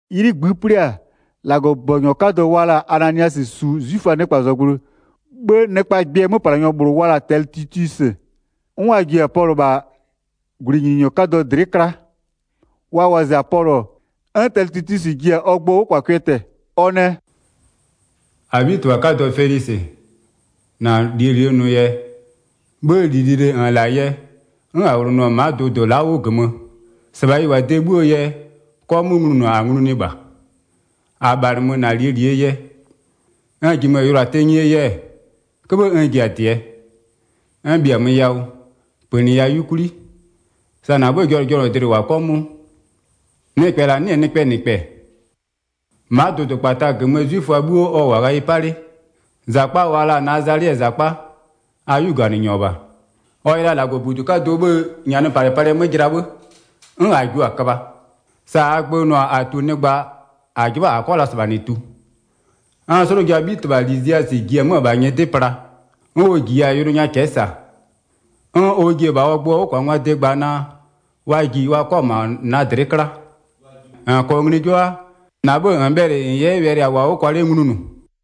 'Ylɩ -ngbï 'plɩ-a, -Lagɔbʋbɔnyɔ 'kadɔ wa la-a Ananiasɩ -su 'zwiföaa nɩkpazɔgblʋɩ, 'bhë nɩkpaa gbɩɛ 'möplanyɔ -bhlʋ wa la-a Tɛlɩtilwisɩ. 'N wa ji-a Pɔlʋ -bha -gwlɩnyininyɔ 'kadɔ dlɩ'ɩ 'kla. Wa wɔzɩ-a Pɔlʋ, 'n Tɛlɩtilwisɩ ji-a ɔ gbʋɔ 'wʋkwakwɩɛ tɛ-ɛ. Ɔ nɛ: “-Abhitɩbha 'kadɔ Felisɩ, -na -lie -li -nʋ yɛ, 'bhë -li lili -n -la-a yɛ 'n -a 'wlonʋɔ-ɔ ma'a dʋdʋ la'a 'wʋ -gömö, -sɩbha ɩ -wʋ-a de 'bhuoo yɛ 'kɔmʋʋ nglunʋ -a nglunʋɩ -bha. -A -bhalɩmö -na -lie -lie yɛ. N -jimö-ö yʋlʋa tenyie yɛ-ɛ, 'köbhë n ji-a -dɩɛ, n -bhiamö yawʋ -pönɩya 'yukwli, sa -na 'bhëë jɔnʋjɔnʋdlɩ -wʋ-a 'kɔmʋʋ. Nɩkpɛ -la 'nɩ-ɛ nɩkpɛɛ -nɩkpɛ. Ma'a dʋdʋkpata -gömöö 'zwiföa 'bhuo ɔ -wʋ-a ghayɩ 'pa 'le. -Zakpa wa la-a Nazalɩɛɛ -zakpa, a 'yuganɩnyɔ -bha. Ɔ yɛ la -Lagɔbudu 'kadʋɔ 'bhëë -nyanɩpalɩpalɩɛ 'mö jɩla 'bhë, 'n -a jio-a köbha. [Sa -aa gbö nʋ-a -a tu nɩkpa -a 'jɩbha -a 'kɔ la -sɩbha -nɩ tu, 'n slʋjaa 'bhitɩbha Liziasɩ ji-e 'mö-ö -bha nyɩdɩ pla, 'n ɔ -jiya-a yʋlʋ nya cɛ'ɛ -sa. 'N ɔ ji-e -bha ɔ gbʋɔ 'wʋkwangwaa de gba naa wa ji wa 'kɔ ma'a -na dlɩ'ɩ 'kla.] -N -kɔɔ ngli 'jɩbha, -na 'bhë -n bhɛlɩ -n 'yɛ wɛlɩ -a -wʋɔ-a 'wʋ kwa 'le nglunʋ.”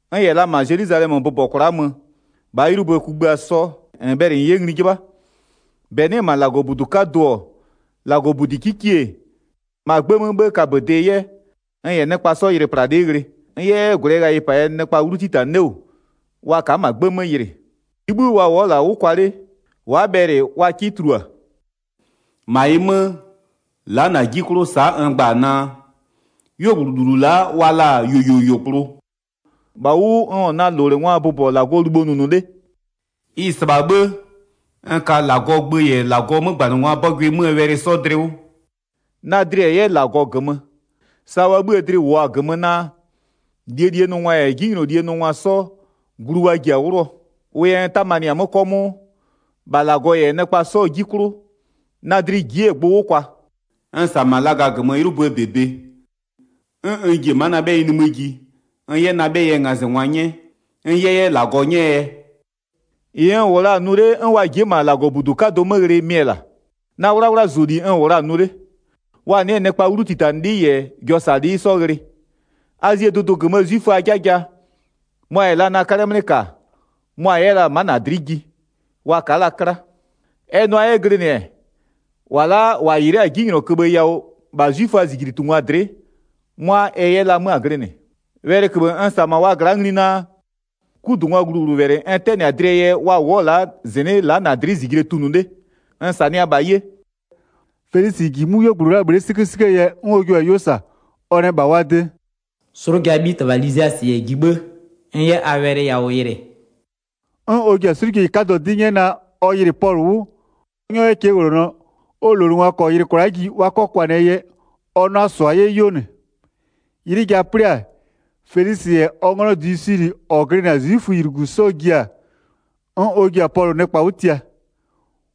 N -yɛ la -ma Zelwizalɛmö bʋbɔ kwla'a mö -bhaa 'ylɩ kugbïa 'sɔ 'nɩ-ɛ -bhla 'plɩ, -n bhɛlɩ -n 'yɛ ngli 'jɩbha. 12-Bɛ nɩ'ɩ-ɛ -ma -Lagɔbudu 'kadʋ-ɔ, -Lagɔbudi 'kikie-e, -ma 'gbë 'mö 'bhë kaböde 'yɛ, n -yɛ nɩkpa 'sɔ ylɩplalɩ'ɩ ghlɩ. N 'yɛ 'yɛ -gwlɩɛ ghayɩpa yɛ nɩkpa 'wlu 'titanɩ 'le -wʋ wa ka'a -ma 'gbë 'mö yɩlɩ. 13-Ɩɩ 'bhï wa wʋ'ʋ-ɔ -la 'wʋ kwa 'le, wa'a bhɛlɩ wa 'kɩ tulua. 14-Ma ɩ 'mö, la'a -na 'ji 'klʋ sa'a n gba-a naa: 'Yuogblʋ -lulu la'a wa la-a yuoyuoyuogblʋ, -bha ʋ 'wʋ n -wʋ-ɔ na -lowlengwaa bʋbɔ -Lagɔɔ libho nʋnʋ 'le. Ɩ-ɩ -sɩbha 'bhë, n ka -Lagɔɔ gbö -yɛ -Lagɔɔ 'mögbanɩngwaa 'bɔgʋɩ 'möö wɛlɩ 'sɔ dlɩ 'wʋ. Na dlɩ-ɛ 'yɛ -Lagɔ -gömö, sa wa 'bhïë dlɩ -wʋʋ-a -gömö naa, -lie -lie nʋnʋngwa -yɛ 'jinylolie nʋngwa 'sɔ glu wa ji-a 'wlʋɔ. Wʋ yɛ n 'tamanɩ-a 'mö 'kɔmʋʋ, -bha -Lagɔ -yɛ nɩkpa 'sɔɔ 'ji 'klʋ na dlɩ ji'i-e gbʋ 'wʋ kwa. N -sa-a -ma laga -gömö 'ylʋböö -bebe, 'n n ji-e ma'a na 'bhɛyɩ nimï ji n 'yɛ na 'bhɛyɩɛ ngazɩngwa 'nyɛ, n 'yɛ 'yɛ -Lagɔ 'nyɛɛ yɛ. 18-Ɩ n -wʋ la-a nʋ 'le, 'n wa ji'i-e -ma -Lagɔbudu 'kadʋ 'mö ghlɩ mɩ-ɛ -la, na 'wlawlazʋli n -wʋ la-a nʋ 'le. Wa nɩ'ɩ-ɛ nɩkpa 'wlutitanɩlɩ -yɛ jɔsalɩ'ɩ 'sɔ ghlɩ. Azie dʋdʋ -gömöö 'zwiföaa 'jaja, mʋa -yɛ la na 'kalɛ 'mlɩ -ka, mʋa-a 'yɛ la-a ma'a -na dlɩ'ɩ ji, wa ka'a 'kla. Ɛ nʋa 'yɛ glɩnɩ-ɛ, -wa la'a -wa -yɩlɩ'ɩ-a 'jinylɔköbhë yawʋ -bha 'zwiföaa -zijlitungwa dlɩ'ɩ 'mʋa ɛ 'yɛ la 'mö-a glɩnɩ. Wɛlɩköbhë n -sa-a -ma wa gla'a ngli naa, 'kudungwaa gluwlʋwɛlɩ n 'tɛnɩ-a dlɩɛ yɛ wa wʋ'ʋ-ɔ la'a -zɩnɩ'ɩ la'a a dlɩ'ɩ -zijle tunʋ 'le, n -sanɩa -bha 'ye.” Felisɩ -ji 'mʋ 'yuogblʋ la'aa bhle'e 'sɩkösɩköö yɛ 'n ɔ jua-a 'ylɩ -sa. Ɔ nɛ -bha wa de: “'Slʋjaa 'bhitɩbha Liziasɩ -yɛ ji 'bhë, n 'yɛ a wɛlɩ yawʋ yɩlɩ.” 'N ɔ ji-a 'slʋjeyi 'kadɔ 'dɩ 'nyɛ naa ɔ yɩlɩ Pɔlʋ 'wʋ, ɔ 'nyɔ 'yɛ cɛɛwlonɔ, ɔ -lowlengwa -kɔɔ yɩlɩ kwla'a ji wa 'kɔ kwanɩɛ yɛ ɔ 'na-a -sʋa 'yɛ 'yuo -nɩ. 'Ylɩ ja 'plɩ-a, Felisɩ -yɛ ɔ 'nglɔ Dlusilɩ -ɔ glɩnɩ-a 'zwiföylugu 'sɔ ji-a, 'n ɔ ji-a Pɔlʋ nɩkpa 'wʋ tia.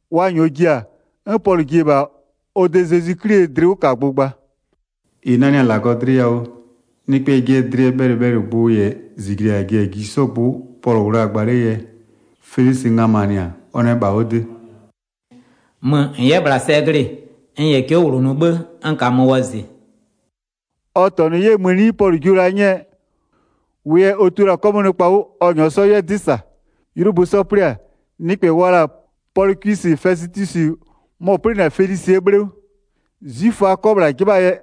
Wa -nyɔɔ ji-a, 'n Pɔlʋ ji-e -bha ɔ de Zezwi 'Klie dlɩwʋkagbʋ gba. 25-Ɩ nanɩ-a -Lagɔ dlɩ yawʋ, nɩkpɛɛ jɩɛ dlɩɛ bhɛlɩbhɛlɩgbʋ -yɛ -zijle -a ji-a ji 'sɔɔ gbʋ Pɔlʋ -wʋ la-a gba 'lee yɛ, Felisɩ nganɩmanɩ-a, ɔ nɛ -bha ɔ de: “Mö -n 'yɛ -bhla sɛ glɩ-ɩ, n -yɛ cɛ'ɛ -wlonʋ 'bhë n -kamö wɔzɩ.” Ɔ -tɔnʋ 'yɛ mëni Pɔlʋ jio la 'nyɛɛ, wʋ yɛ ɔ tio la-a 'kɔmʋʋ nɩkpa 'wʋ ɔ -nyɔɔ 'sɔ 'yɛ 'dɩ -sa. 'Ylʋbö 'sɔ 'plɩ-a, nɩkpɛ wa la-a Pɔlɩkwɩsɩ Fɛsɩtwisɩ mɔ-ɔ 'plɩnɩ-a Felisɩɛ 'bhle 'wʋ. 'Zwiföa 'kɔ -bhla 'jɩbhaa yɛ,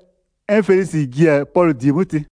'n Felisɩ ji-a Pɔlʋ -die 'mö tɩ.